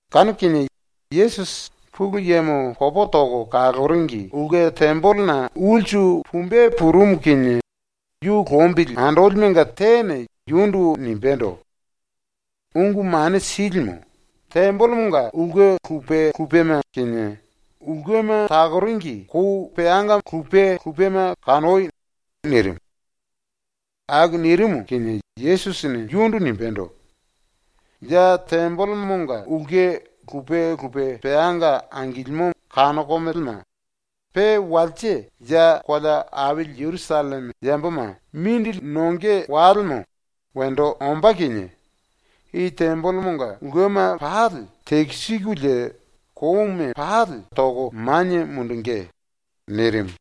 Kanu kinie Yesusi ⸤Pulu Yemo popo toko kaloringi⸥ ulke tembelena ulsu pumbe purumu kinie yu lombili andolimenga tene yundu nimbendo: “Ungu Mane Silimu, tembelemonga ulke lupe lupema kinie, ulkema takoringi kou peanga lupe lupema kanoi.” nirimu. ⸤Aku nirimu kinie⸥ Yesusini yundu nimbendo: “Ya ⸤tembelemonga⸥ ulke lupe lupe peanga angilimo kanokomelema, pe ⸤walse ya kolea aili Jerusalleme yamboma mindili nonge walemo wendo ombá kinie⸥ i tembelemonga ulkema pali tekisikulie kouma pali toko manie mundungí.” nirimu.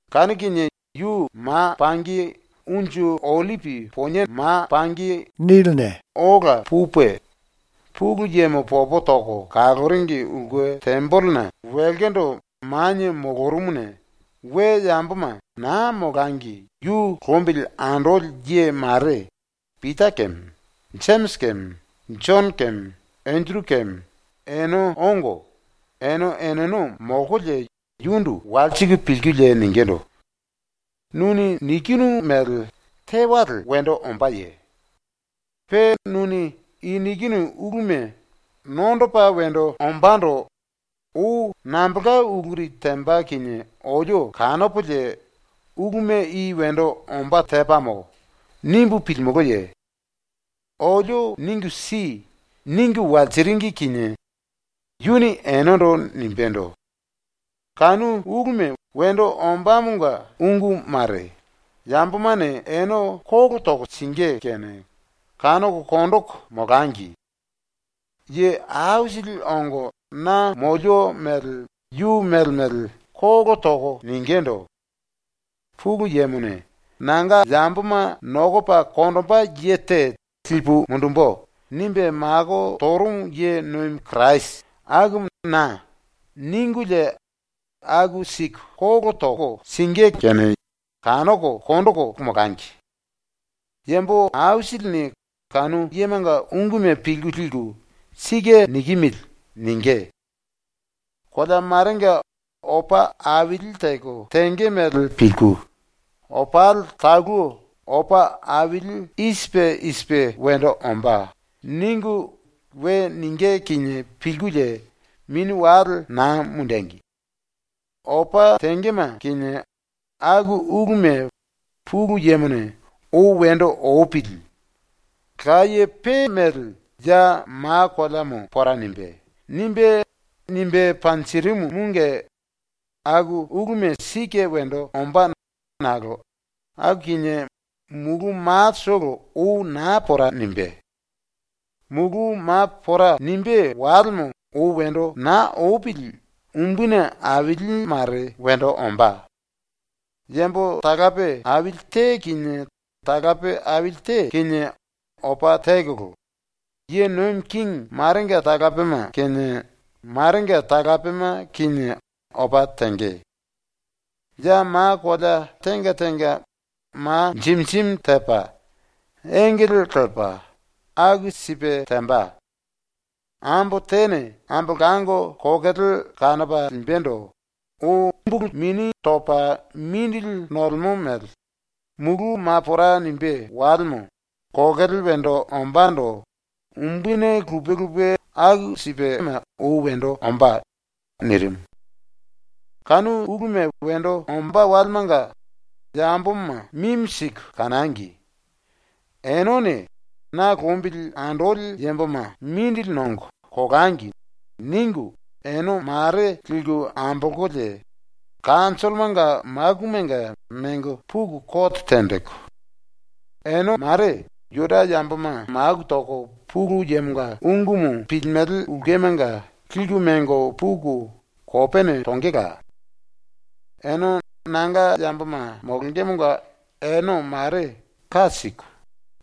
Kanu kinie yu ma pangi Unju Ollipi Poniena ola pupe ⸤Pulu Yemo popo toko kaloringi⸥ ulke tembelena wilkindu manie molorumuna we yamboma naa molangi ⸤yu lombili andoli ye mare⸥ Pita keme, Jemisi keme, Jono keme, Enderu keme ene ongo, ene eneno molkolie yundu walsiku pilkulie ningindu: “Nuni nikinu mele tewale wendo ombáye? Pe nuni i nikinu uluma nondopa wendo ombándo ou nambolka uluri temba kinie olio kanopolie ‘Uluma i wendo ombá tepamo.’ nimbu pilimulúye? Olio ningu si.” ningu walsiringi kinie yuni enendo nimbendo: “⸤Kanu uluma wendo ombámonga ungu mare⸥ yambomane ene kolo toko singí kene kanoko konjiku molangi. Ye aisili ongo na molio mele yu mele mele kolo toko ningindu: “⸤Pulu Yemone ‘Nanga yamboma nokopa konjimbe lipu mundumbu.’ nimbe mako torumu ye nomi Kirasi⸥ akumu na.” ningulie aku siku kolo toko singí kene kanoko konjiku molangi. Yambo aisilini kanu yemanga unguma pilku liku “Sike nikimili.” ningí. “Kolea marenga opa aili teko tenge mele pilku, ‘Opali talu opa aili i sipe i sipe wendo ombá.’ ningu we ningí kinie pilkulie mini wale naa mundengi. Opa tengema kinie aku uluma Pulu Yemone ‘Ou wendo opili. Laye pe mele ya ma koleamo pora nimbé.’ nimbe, nimbe panjirimumunge aku uluma sike wendo ombá nakolo aku kinie mulu matolo ou naa pora nimbé. ⸤Mulu ma pora nimbé walemo ou wendo naa opili umbuni aili mare wendo ombá.⸥ yambo talape aili te kinie talape aili te kinie opa tekolo, ye nomi kingi marenga talapema kinie marenga talapema kinie opa tenge. Ya ma kolea tenga tenga ma jimi jimi tepa, engele lepa, aku sipe temba. Ambo tene ambolango kokele kanopa limbendo ou mini topa mindili nolemo mele, mulu ma pora nimbé walemo kokele wendo ombándo umbuni lupe lupe aku sipema ou wendo ombá.” ⸤nirimu.⸥ “⸤Kanu uluma wendo ombá walemanga⸥ yamboma mimi siku kanangi. Enene ⸤‘Na lombili andoli yamboma mindili nongo, kolangi.’ ningu,⸥ ene ⸤mare liku ambolkolie⸥ kanjollomanga makumanga mengo puku kote tenjiku, ene ⸤mare⸥ Juda yamboma maku toko Pulu Yemonga ungumu pilimele ulkemanga liku mengo puku kopene tongela. Ene nanga yamboma molongemonga ene ⸤mare ka siku⸥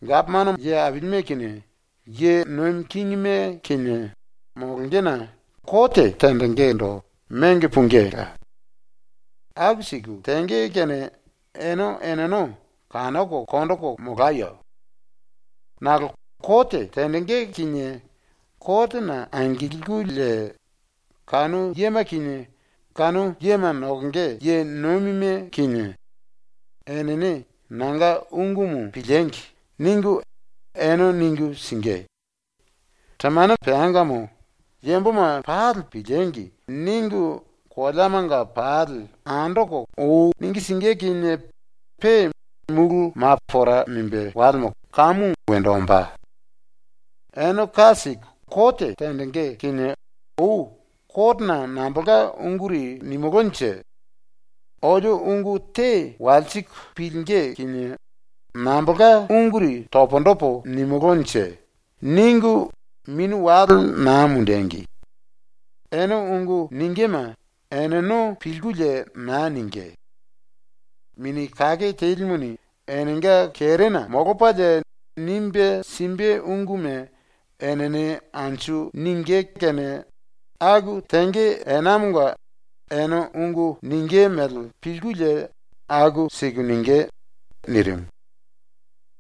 gapomano ye ailime kinie ye nomi kingime kinie molongena ⸤kote tenjingindu⸥ mengo pungíla. Aku siku tenge kene ene eneno kanoko konjiku molayo. ⸤Nakolo kote tenjingí kinie kotena angilkulie kanu yema kinie kanu yema nokonge ye nomime kinie⸥ enene ‘Nanga ungumu piliengi!’ ningu ene ningu singí. Temane peangamo ‘Yamboma pali piliengi!’ ningu koleamanga pali andoko ou ningu singí ⸤kinie, pe mulu ma pora nimbé walemo kamu wendo ombá⸥.. Ene ka siku kote tenjingí kinie ou ‘Kotena nambolka unguri nimulúnje? Olio ungu te walsiku pilingí kinie nambolka unguri pundu topo nimulúnje?’ ningu mini wale naa mundengi. Ene ungu ningíme eneno pilkulie naa ningí. Mini Kake Telimuni enenga kerena molopalie nimbe simbe unguma enene anju ningí kene aku tenge enamonga ene ungu ningí mele pilkulie aku siku ningí.” ⸤nirimu.⸥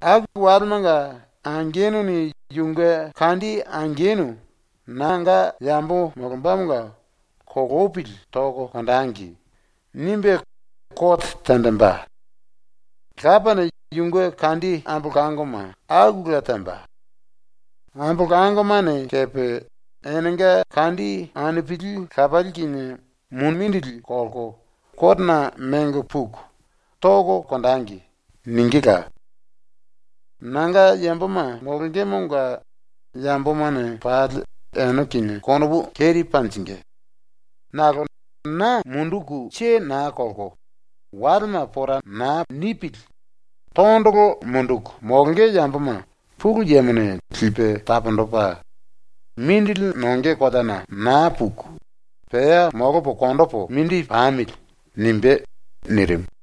“⸤Aku walemanga⸥ angenuni yunge kandi angenu ⸤nanga yambo molombamonga⸥ ‘Kolopili toko konjengi.’ nimbe kote tenjimbe. Lapane yunge kandi ambolangoma akula temba. Ambolangomane kepe enenga kandi anupili lapali kinie mumindili kolko kotena mengo puku “Toko konjengi.” ningíla. Nanga yamboma molongemonga yambomane pali ene kinie konopu keri panjingí, nakolo na munduku naa kelko walema pora naa nipili tondolo munduku molonge yamboma Pulu Yemone lipe taponjipe ‘Mindili nonge koleana naa puku pea molopo konjipu mindi pamili.’ nimbé.” ⸤nirimu.⸥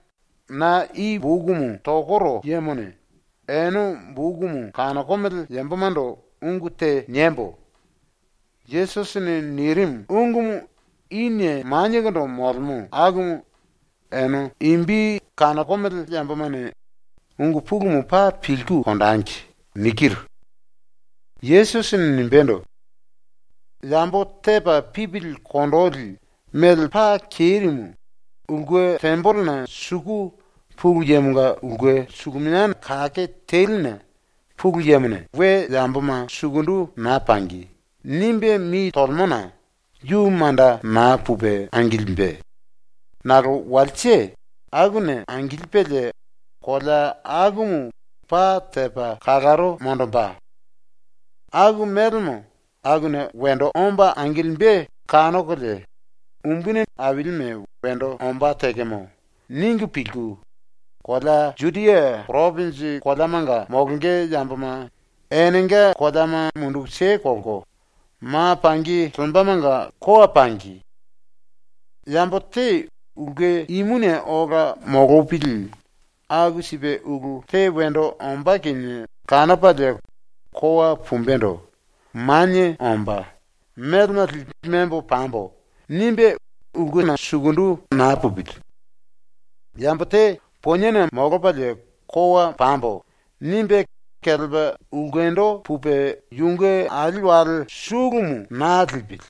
(⸤Na i bokumu tokoro yemone⸥ ene bokumu kanokomele yambomando ungu te niembo: ‘⸤Yesusini nirimu⸥ ungumu inie maniekondo molemo akumu ene imbi kanokomele yambomane ungu pulumu paa pilku konjengi.’ ⸤nikiru: Yesusini nimbendo:⸥) “⸤Yambo⸥ tepa pipili kondoli mele paa kerimu ⸤ulke tembelena suku Pulu Yemonga Ulke Suluminia Kake Teline Pulu Yemone⸥ “We yamboma naa pangi!” nimbe mi tolemona yu manda naa pupe angilimbe, nakolo walse akuna angilipelie kolea akumu paa tepa kalaro monjimbe. Aku melemo akuna ⸤wendo omba⸥ angilimbe kanokolie ⸤‘Umbuni ailime wendo ombá tekemo.’ ningu pilku⸥ kolea Judia poropinji koleamanga molonge yamboma ⸤enenga koleama munduku kelko⸥ ma pangi lembamanga kowa pangi. Yambo te ulke imuna ola molopili ⸤aku sipe ulu te wendo ombá kinie kanopalie kowa pumbendo⸥ manie omba ‘Melema lipu membo pambo.’ nimbe ulkena sukundu manda naa pupili. Yambo te poniena molopalie ⸤‘Kowa pambo.’ nimbe⸥ kelepa ulkendo pupe yunge ali wale sulumu naa lipili.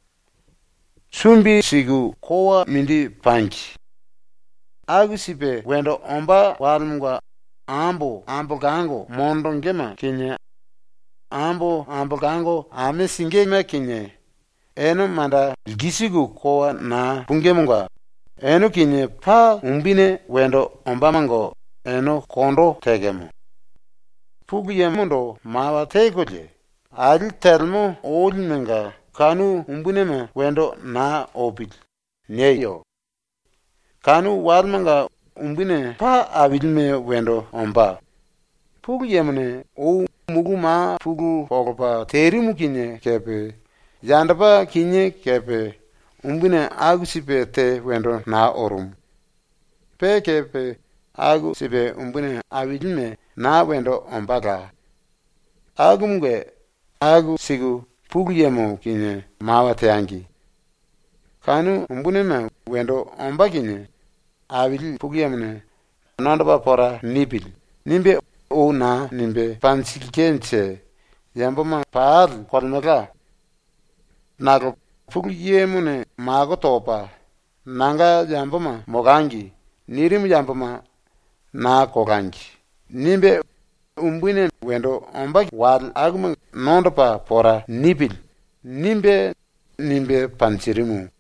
⸤Sumbi siku kowa mindi pangi.⸥ Aku sipe wendo ombá walemonga ambo ambolango monjingíme kinie, ambo ambolango ame singíme kinie, ⸤ene manda lkisiku kowa naa pungímunge⸥ ene kinie paa umbuni wendo ombamonga ene kondo tekemo. “Pulu Yemondo mawa tekolie, ‘Ali telemo olimenga kanu umbunime wendo naa opili.’ nieyo. Kanu walemanga umbuni paa ailime wendo ombá, Pulu Yemone ou mulu ma pulu monjipe terimu kinie kepe, yandopa kinié kepe umbuni aku sipe te wendo naa orumu. Pe kepe aku sipe umbuni ailime naa wendo ombála. Akumunge aku siku Pulu Yemo kinie mawa teangi. ⸤Kanu umbunime wendo ombá kinie⸥ Aili ⸤Pulu Yemo⸥ ne ‘Nondopa pora nipili.’ nimbe ou naa nimbe panjilkenje yamboma pali kolemelka. Nakolo Pulu Yemone mako topa ‘Nanga yamboma molangi.’ nirimu yamboma ‘Naa kolangi.’ nimbe ‘Umbuni wale akuma nondopa pora nipili.’ nimbe, nimbe panjirimu.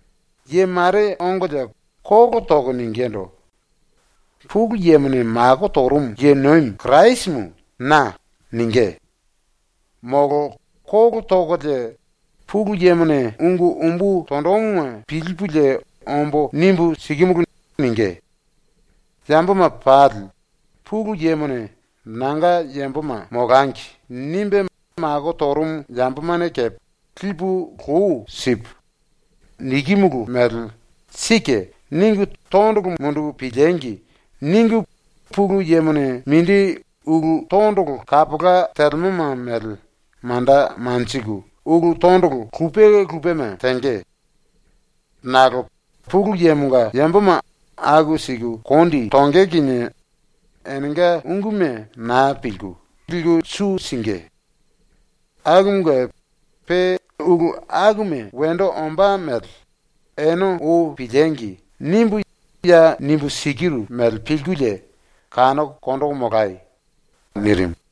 Ye mare ongolie kolo toko ningindu: “Pulu Yemone mako torumu ye nomi Kirasimu na.” ningí, molo kolo tokolie “Pulu Yemone ungu umbu tonjimuma pilipulie ombo nimbu sikimulu.” ningí. ‘Yamboma pali, Pulu Yemone ‘Nanga yamboma molangi.’ nimbe mako torumu yambomane kepe lipu lou sipu, nikimulu mele ‘Sike.’ ningu tondolo munduku piliengi!’ ningu Pulu Yemone mindi ulu tondolo kapola telemoma mele manda lelko ulu tondolo lupe lupema tenge. Nakolo Pulu Yemonga yamboma aku siku kondi tonge kinie enenga unguma naa pilku, liku su singí. Akumunge, pe ulu akuma wendo ombá mele ‘Ene ou piliengi!’ nimbu ya nimbu sikiru mele pilkulie kanoko konjiku molai!” ⸤nirimu.⸥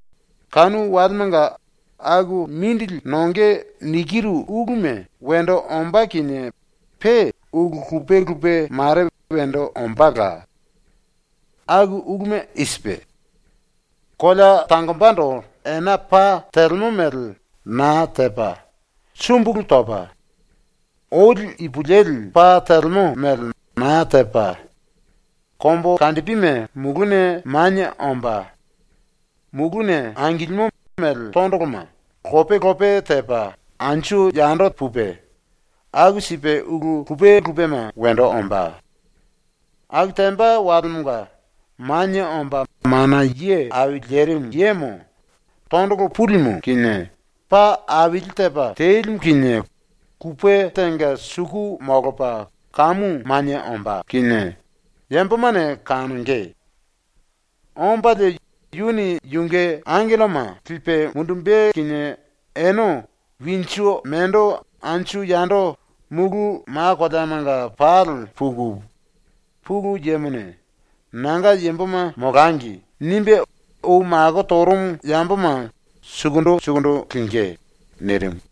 “Kanu walemanga aku mindili nonge nikiru uluma wendo ombá kinie pe ⸤ulu lupe lupe mare wendo ombála. Aku uluma i sipe:⸥ ‘Kolea tangombando ena pa telemo mele naa tepa, sumbulu topa, oli ipulueli pa telemo mele naa tepa, kombukandipime muluna manie omba, muluna angilimo mele tondoloma lope lope tepa anju yando pupe, aku sipe ulu lupe lupema wendo ombá.’ Aku temba walemonga Manie Omba Mana Ye Au Lerimu Yemo tondolo pulimu kinie, pa aili tepa telimu kinie kupe tenga suku molopa kamu manie ombá yambomane kanonge. Ombalie yuni yunge angelloma lipe mundumbe kinie ene winju mendo anju yando mulu ma koleamanga pali puku Pulu Yemone ‘Nanga yamboma molangi.’ nimbe ou mako torumu yamboma sukundu sukundu lingí.” ⸤nirimu.⸥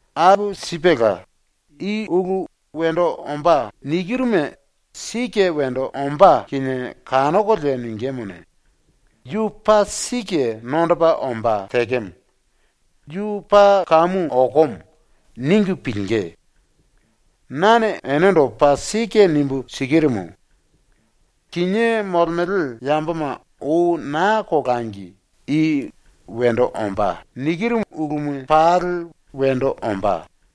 Aku sipela, i ulu “Wendo ombá.” nikiruma sike wendo ombá kinie kanokolie ningímuni ‘Yu paa sike nondopa ombá tekemo. Yu paa kamu okomo.’ ningu pilingí. “Nane enendo paa sike nimbu sikirumu: Kinié molemele yamboma ou naa kolangi i “Wendo ombá.” nikiru uluma pali wendo ombá.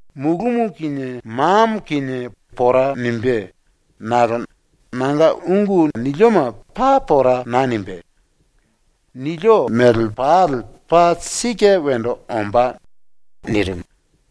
Mulumu kinie mamo kinie pora nimbé nakolo nanga ungu nilioma paa pora naa nimbé. ⸤Nilio mele pali paa sike wendo ombá.⸥” ⸤nirimu.⸥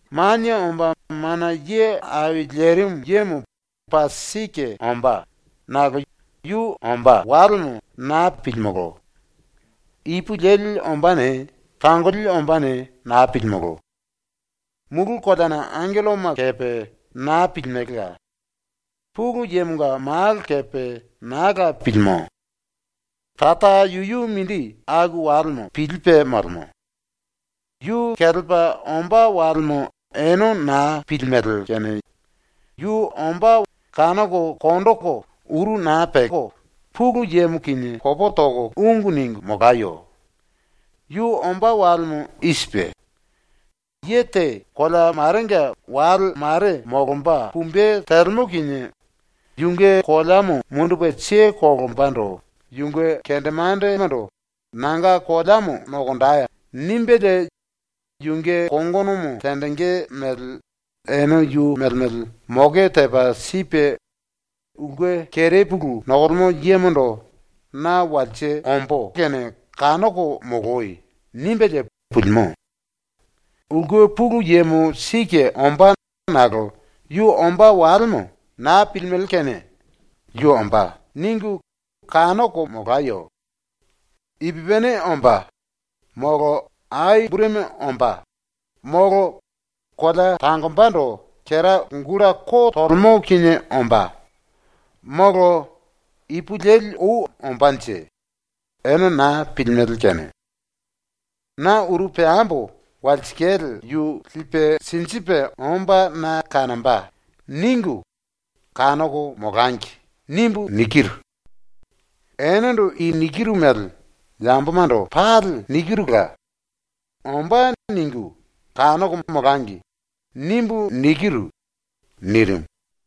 “⸤Manie Omba Mana Ye Au Lerimu Yemo paa sike ombá⸥ nakolo yu ombá walemo naa pilimolo. Ipulueli ombáne, tangoli ombáne naa pilimolo. Mulu koleana angelloma kepe naa pilimelela. Pulu Yemonga Malo kepe naa la pilimo. Tara yuyu mindi ⸤aku walemo⸥ pilipe molemo. Yu kelepa ombá walemo ene naa pilimele kene yu ombá kanoko konjiku, uru naa peko (Pulu Yemo kinie ungu ningu) molayo. Yu ombá walemo i sipe: Ye te kolea marenga wale mare molomba pumbe telemo kinie yunge koleamo mundupe kelembando yunge kendemandemando “Nanga koleamo nokonjei.” nimbelie yunge kongonomo tenjingí mele ene yu mele mele moke tepa sipe ulke kerepulu nokolemo yemondo “Na walse ombó kene kanoko moloi.” nimbelie pulimo. “Ulke pulu yemo sike ombá nakolo yu ombá walemo naa pilimele kene ‘Yu ombá.’ ningu kanoko molayo. Ipupini ombá, molo ai burumi ombá, molo kolea tangombando kera gulta ko tolemo kinie ombá, molo ipulueli ou ombánje, ene naa pilimele kene ‘ ‘Na uru peambo walsikale yu lipe sinjipe omba na kanomba.’ ningu, kanoko molangi.’ nimbu nikiru. “Enendo i nikiru mele yambomando pali nikirula, ‘⸤‘Ombá.’ ningu⸥ kanoko molangi.’ nimbu nikiru.” nirimu.